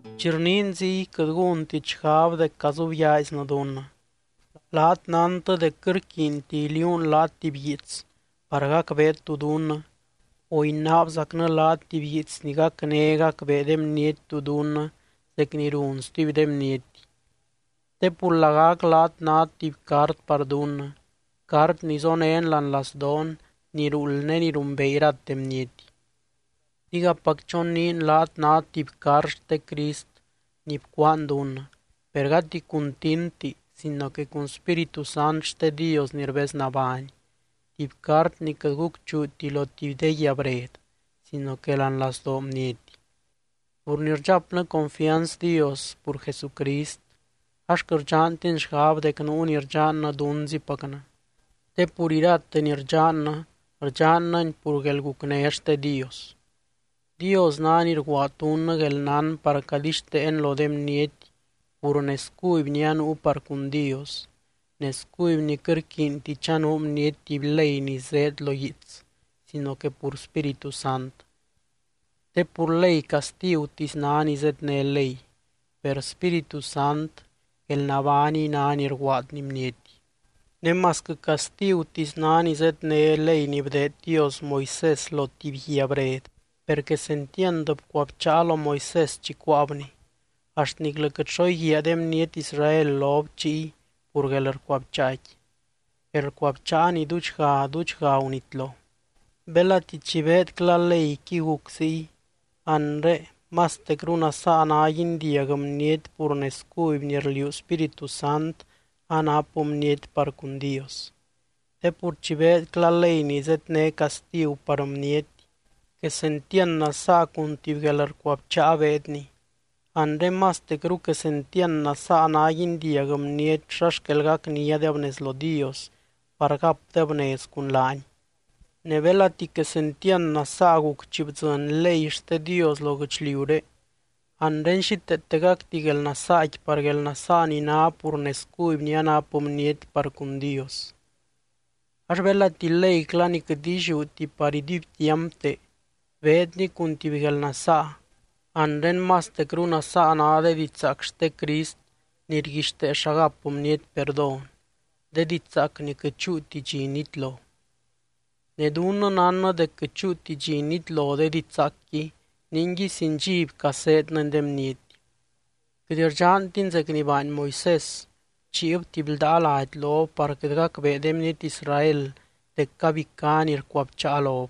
Chi rniin ziy, quɨt gúntit xgab dec cazubyaaiznɨ dunnɨ. Laat nántɨ dec quɨt rquiinti iliuunɨ laat tuby guiits par gacbeet tú dunnɨ o inaabzacnɨ laat tuby guiits ni gacné gacbee de bniety tú dunnɨ zec ni run stuby de bniety. Te pur lagac laat nát tuby cart par dunnɨ, cart ni zonén láani lazdoon ni ruuld ne ni rumbee irate bniety. Digapac choniin laat nát tuby cart xte Crist ni bcuaan dunnɨ, per gati cun tintti sino que cun Spíritu Sant xte Dios ni rbeznabány, tuby cart ni quɨt gucchuuti lo tuby de guia bred sino que láani lazdoo bniety. Pur ni rdxapnɨ confianz Dios pur Jesucrist, ax quɨt rdxantin xgab dec nuu ni rdxannɨ dunzipacnɨ, te pur irate ni rdxannɨ, rdxannɨni pur guelgucné xte Dios. Dios ná ni rguaad dunnɨ guelnán par cadixteen lo de bniety pur nez cuby ni anuu par cun Dios, nez cuby ni quɨt rquiinti chanuu bniety tuby ley ni zéed lo guiits sino que pur Spíritu Sant. Te pur ley castigutisy ná ni zédne ley, per Spíritu Sant guelnabániy ná ni rguaadny bniety. Ne masquɨ castigutisy ná ni zédne ley ni bdeed Dios Moisés lo tuby guia bred, per quesentiand bcuabcháa lo Moisés chi cuáabni, axt niclɨ quɨt xo íguia de bniety Israel lob chiy pur guelrcuabcháaqui, guelrcuabcháa ni duudxga duudxga gunitlo. Belati chi beedcla leyqui guc ziy, anre, ¡mastecru nasaa ná guindiag bniety pur nez cuby ni rliuu Spíritu Sant anap bniety par cun Dios! Te pur chi beedcla ley ni zédne castigu par bniety, quesentiand nasaa cun tuby guelrcuabcháa beedni, anre, ¡mastecru quesentiand nasaa ná guindiag bniety xa xquel gacníadeb nez lo Dios par gapdeb nez cun laany! Ne belati quesentiand nasaa guc chi bdzɨny ley xte Dios lo guɨchliuré, anre xíteeteacti guelnasaaqui par guelnasaa ni ná pur nez cuby ni anap bniety par cun Dios. Ax belati leycla ni quɨt illiúti par iduibtiampte, beedni cun tuby guelnasaa, anre mastecru nasaa ná de didxzaac xte Crist ni rguixtee xa gap bniety perdón, de didxzaac ni quɨt chúuti dxi nitlo. Ne dunnɨ nánnɨ dec quɨt chúuti dxi nitlo de didxzaacqui, ninguiy sin dxiby caseednɨny de bniety. Quɨt rdxantin zec ni baany Moisés, bchiib tuby ldaa lady lob par quɨt gacbee de bniety Israel dec cabicá ni rcuabcháa lob,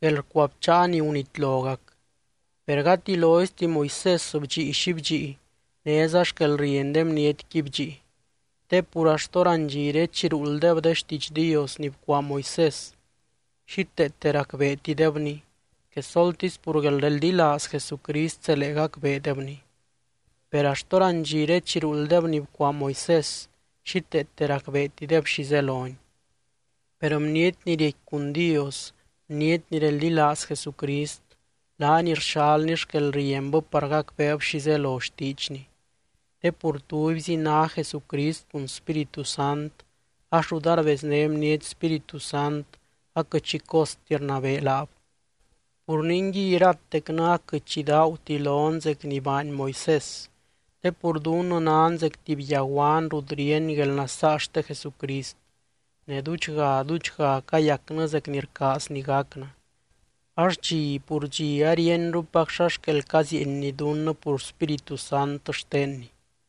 guelrcuabcháa ni gunitlogac. Per gati loizti Moisés bdxii xi bdxii, néza xquelrieny de bnietqui bdxii. Te pur axt hórandxire chi ruulddeb de xtiidx Dios ni bcuaa Moisés, xíteete racbeetidebni, quesoltisy pur guelreldilaaz Jesucrist zelee gacbeedebni. Per axt hórandxire chi ruulddeb ni bcuaa Moisés, xíteete racbeetideb xi zeloni. Per bniety ni riecqui cun Dios, bniety ni reldilaaz Jesucrist, laany rxalny xquelrienbɨ par gacbeeb xi zelo xtiidxny. Te pur tubyzi ná Jesucrist cun Spíritu Sant, ax rut arbezné bniety Spíritu Sant aquɨt xi costi rnabee laab. Pur ningui iratecnɨ aquɨt xi daaguti lon zec ni baany Moisés, te pur dunnɨ nan zec tuby yaguan rut ríeny guelnasaa xte Jesucrist ne duudxga duudxga cayacnɨ zec ni rcaazny gacnɨ, ax dxi pur dxi aríenrupac xa xquel cazieenny dunnɨ pur Spíritu Sant xtenny.